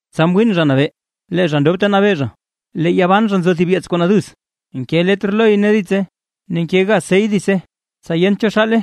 Tsa mwiin Zha Nabee, lee zha ndob ta nabee zha, ne yaa ban zha nzo thib yeets kuu naduz, ne nke letr loy ne ditse, ne nke gaz sey ditse, tsa yent cho xaale.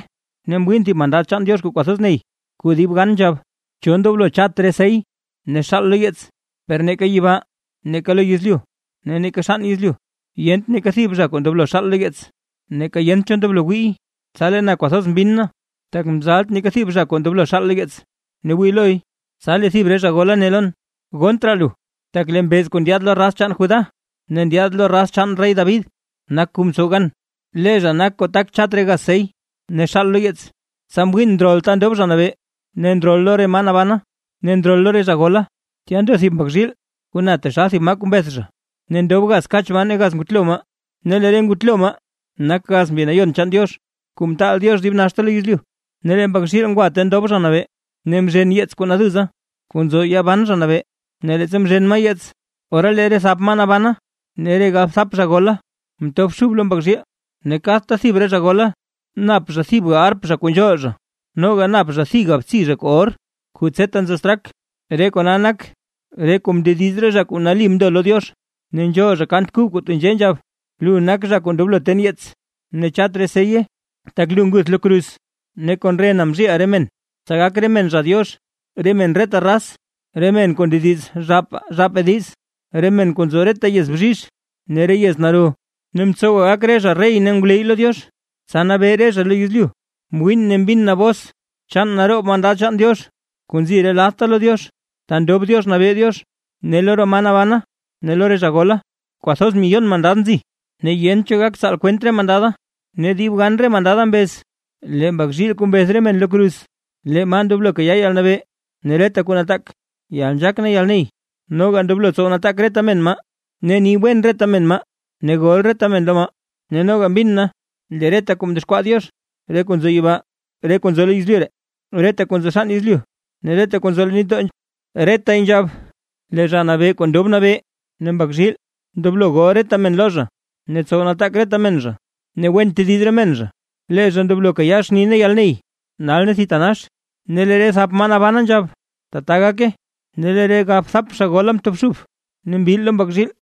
Ne mwiin thib mandad chaan Diox kuu kwathoz ney kuu dib gan nzhab: ―¿Cho ndoblo chat re sey ne xaal lo yeets? Per neeka yibaa, neeka lo yezlyu ne neeka xann yezlyu, yent neeka thib zha kuu ndoblo xaal lo yeets, neeka yent cho ndoblo wiiy. Tsa lee na kwathoz mbinn na, tak mzalt neeka thib zha kuu ndoblo xaal lo yeets ne wii loy. Tsa lee thib re zha gola ne lon: ―Gonnt raa lu, tak lee mbeez kuu ndyaad lo raz chaan Judá, ne ndyaad lo raz chaan rey David nak kuu mtsow gan. Lee zha nak kuu tak chat re gaz sey ne xaal lo yeets. Tsa mwiin ndrol ta ndob Zha Nabee, ne ndrol lo re maa nabana ne ndrol lo re zha gola, tya ndo thib Mbak zhiil kuu na taxal thib maa kuu mbeth zha. Ne ndob gaz kach maa ne gaz ngutlo maa; ne lee re ngutlo maa nak gaz Mbi Nayon chaan Diox, kuu mtaal Diox dib naxta lo yezlyu. Ne lee Mbak zhiil ngwa ta ndob Zha Nabee ne mzhen yeets kuu naduza, kuu nzo ya ban Zha Nabee. Ne leettsa mzhen maa yeets, ora lee re thap maa nabana ne re galbthap zha gola mtobxub lo Mbak zhiil. Ne kadta thib re zha gola nap zha thibga arp zha kuu nzhool zha, noga nap zha thibga btsi zha kuu or kuu tseta nzo straak, re kona nak re kuu mndediz re zha kuu nali mndo lo Diox. Ne nzhool zha kant kub kuu tenzhee nzhab: Lu nak zha kuu ndoblo ten yeets ne chat re seye; tak lu nguth lo kruz, ne kon rena mzhiiʼa re men, tsa gak re men zha Diox, re men reta raz, re men kuu ndediz zhaapaa zhaapaa diiz, re men kuu nzo reta yez bzhizh ne re yez naro. Ne mtsowa gak re zha rey ne ngwleyy lo Diox, tsa nabee re zha lo yezlyu. Mwiin ne mbin na bos chaan naroob mandad chaan Diox kuu nzi re ladta lo Diox, ta ndob Diox nabee Diox ne lo re maa nabana ne lo re zha gola. Kwathoz miyon mandad nzi ne yent cho gak tsaal kwent re mandada, ne dib gan re mandada mbez: Lee Mbak zhiil kuu mbeth re men lo kruz. Lee maa ndoblo kayaa yalnabee ne reta kuu nataak, yalnzhaak ne yalney, noga ndoblo tsow nataak reta men maa, ne ni wen reta men maa, ne gol reta men lo maa. Ne noga mbin na lee reta kuu mdexkwaa Diox, re kuu nzo yibaa, reta kuu nzo lo yezlyu, reta kuu nzo xann yezlyu ne re kuu nzo leen nitdoo, retay nzhab: ¡Lee Zha Nabee kuu ndob nabee, ne Mbak zhiil, ndoblo gol reta men lo zha, ne tsow nataak reta men zha, ne wen tediz re men zha, lee zha ndoblo kayaa xni ne yalney, nal ne thitanax! Ne lee re thap maa nabana nzhab: ―¡Tata gake! Ne lee re galbthap zha gola mtobxub ne mbil lo Mbak zhiil.